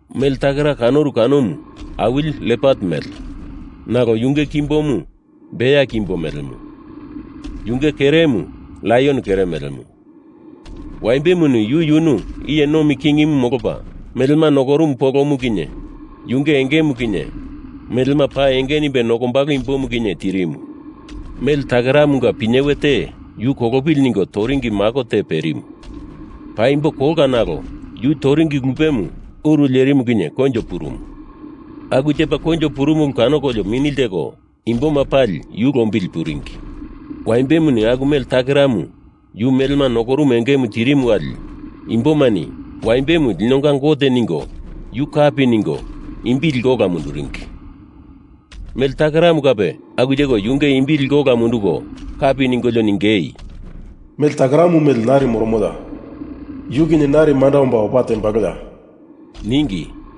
Mele takera kanoru kanomu awili lepat mele, nalo yunge kimbomu bea kimbo melemu, yunge keremu laion kere melemu. Waimbemuni yu yunu iye nomi king molopa melema nokorumu polomu kinye, yunge engemu kinye, melema paa enge nimbe nokombalo imbimu kinye, tirimu. Mele takeramunga pinyewe te yu kolopili ningo toringi mako te perimu. Paimbo kolka nalo yu toringi lupemu uru lerimu kinye koinjo purumu. Aku tepa koinjo purumu ulu kanoko mini ltekolio imboma pali yu lombili puringi. Waimbemuni aku mele takeramu yu melema nokorumu engema tirimu wali imbomani Waimbemu linonga gote ningo yu kapi ningo imbi liko ola munduringi. Mele takeramu kape aku teko yunge imbi liko ola munduko kapi ningolio ningei, “Mele takeramu mele nari moromoya? Yu kinye narini manda omba opa tembaloya?” ningi.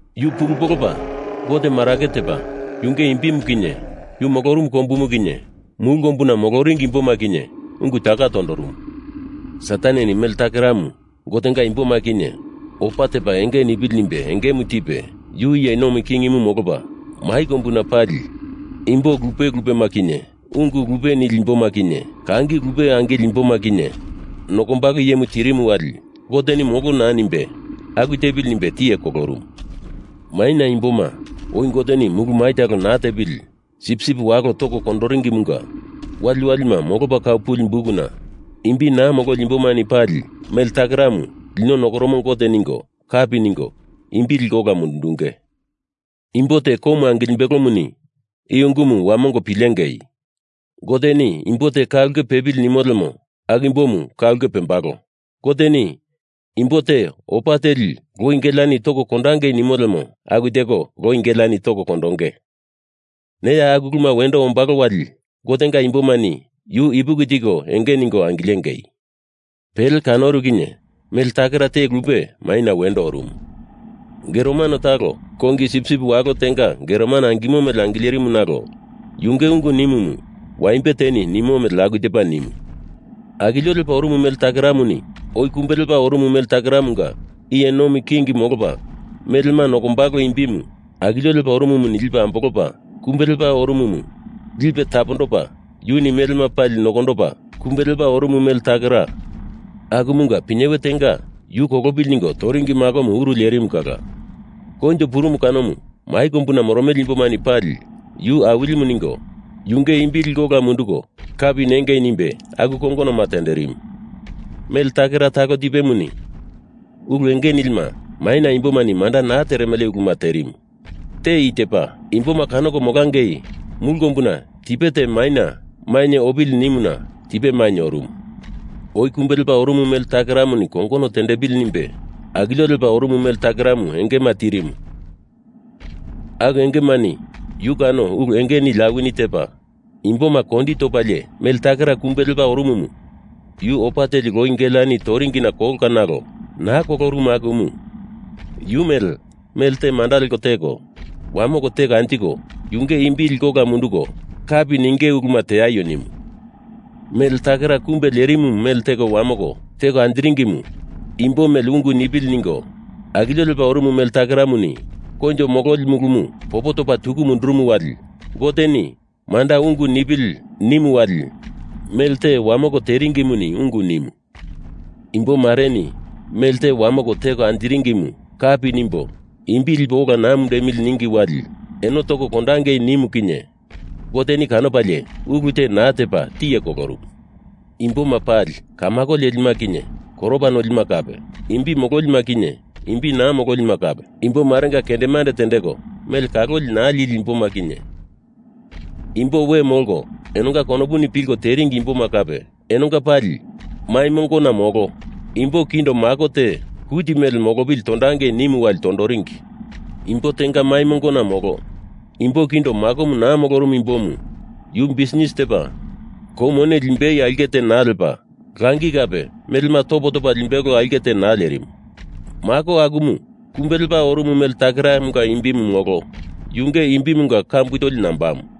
Yu pulu polopa Gote marake tepa yunge imbimu kinye yu molorumu kombumu kinye mulu kombuna moloringi imboma kinye ungu taka tondorumu. Sataneni mele takeramu Gotenga imboma kinye opa tepa enge nipili nimbe engemu tipe, yu iye nomi kingimu molopa mai kombuna pali imbo talape lupe lupema kinye, ungu lupe lupe nimele imboma kinye, kangi lupe lupe angileli imboma kinye nokombalo imbimu tirimu wali Goteni molo naa nimbe, aku tepili nimbe tiye kolorumu. Maina imboma oi Goteni mulu mai talo naa tepili Sipsip Walo toko kondoringimunga waliwalima molopa kau puli bukuna imbi naa mololi imbomani pali mele takeramu lino nokoromo gote ningo kapi ningo imbi liko ola mundundunge. Imbo te komu angilimbelomuni i ungumu wamongo pilengei. Goteni imbo te ka ulke pepili nimo lemo aku imbomu ka ulkena pembalo. Goteni imbo te opa teli loi geleani toko kondangei nimo lemo aku teko loi geleani toko kondonge. Neya aku uluma wendo ombalo wali Gotenga imbomani yu ipuki tiko enge ningo angilengei. Pele kanoru kinye mele takera te lupe maina wendo orumu. Geromano talo kongi sipsip walo tenga geromano angimo mele angilerimu nalo yunge ungu nimumu Waimbe teni nimo mele aku tepa nimu. Akilio lepa orumu mele takeramuni oi kumbe lepa orumu mele takeramunga iye nomi king molopa melema nokombalo imbimu akilio lepa orumumuni lipe ambolopa kumbe lepa orumumu lipe tapondopa yuni melema pali nokondopa kumbe lepa orumu mele takera, akumunga pinyewe tenga yu kolopili ningo toringi makomu uru lerimu kala koinjo purumu kanomu mai kombuna moromele imbomani pali yu Awilimu ningo yunge imbi liko ola munduko kapi nengei nimbe aku kongonoma tenderimu. Mele takera talo tipemuni ulu enge nilima maina imbomani manda naa teremele uluma terimu. Te i tepa: Imboma kanoko molangei mulu kombuna tipe te maina mainye opili nimuna tipe mainye orumu. Oi kumbe lepa orumu mele takeramunga kongonoma tendepili nimbe akilio lepa orumu mele takeramu engema tirimu aku engemani yu kano ulu enge nili awini tepa, imboma kondi topalie mele takera kumbe lepa orumumu, yu opa teli loi geleani toringina kolka nalo naa kolorumu akumu yu mele melte manda leko teko wamoko teko anjiko, yunge imbi liko ola munduko kapi ninge ulumu teaio nimu. Mele takera kumbe lerimu mele teko wamoko teko anjiringimu imbo mele ungu nipili nimbe akilio lepa orumu mele takeramuni koinjo mololi mulumu popo topa tuku mundurumu wali Goteni manda ungu nipili nimu wali mele teko wamoko teringimuni ungu nimu. Imbo mareni mele teko wamoko teko anjiringimu kapi nimbo imbi lipo ola naa mundemili ningi wali eno toko kondangei nimu kinye Goteni kanopalie, ulu te naa tepa tiye kolorumu. Imboma pali, kamako lelima kinye koropa nolima kape, imbi mololima kinye imbi naa mololima kape, imbo marenga kendemande tendeko mele kaloli naa lili imboma kinye imbo we molko enonga konopuni pilko teringi imboma kape, enonga pali mai mongona molo imbo kindo mako te kuti mele molopili tondangei nimu wali tondoringi. Imbo tenga mai mongona molo imbo kindo makomu naa molorumu imbomu yu bisnis tepa kou mone limbei aulke te naa lepa, langi kape melema topo topa limbei aulke te naa lerimu. Mako akumu kumbe lepa orumu mele takeramunga imbimu molo yunge imbimunga kambu toli nambamu.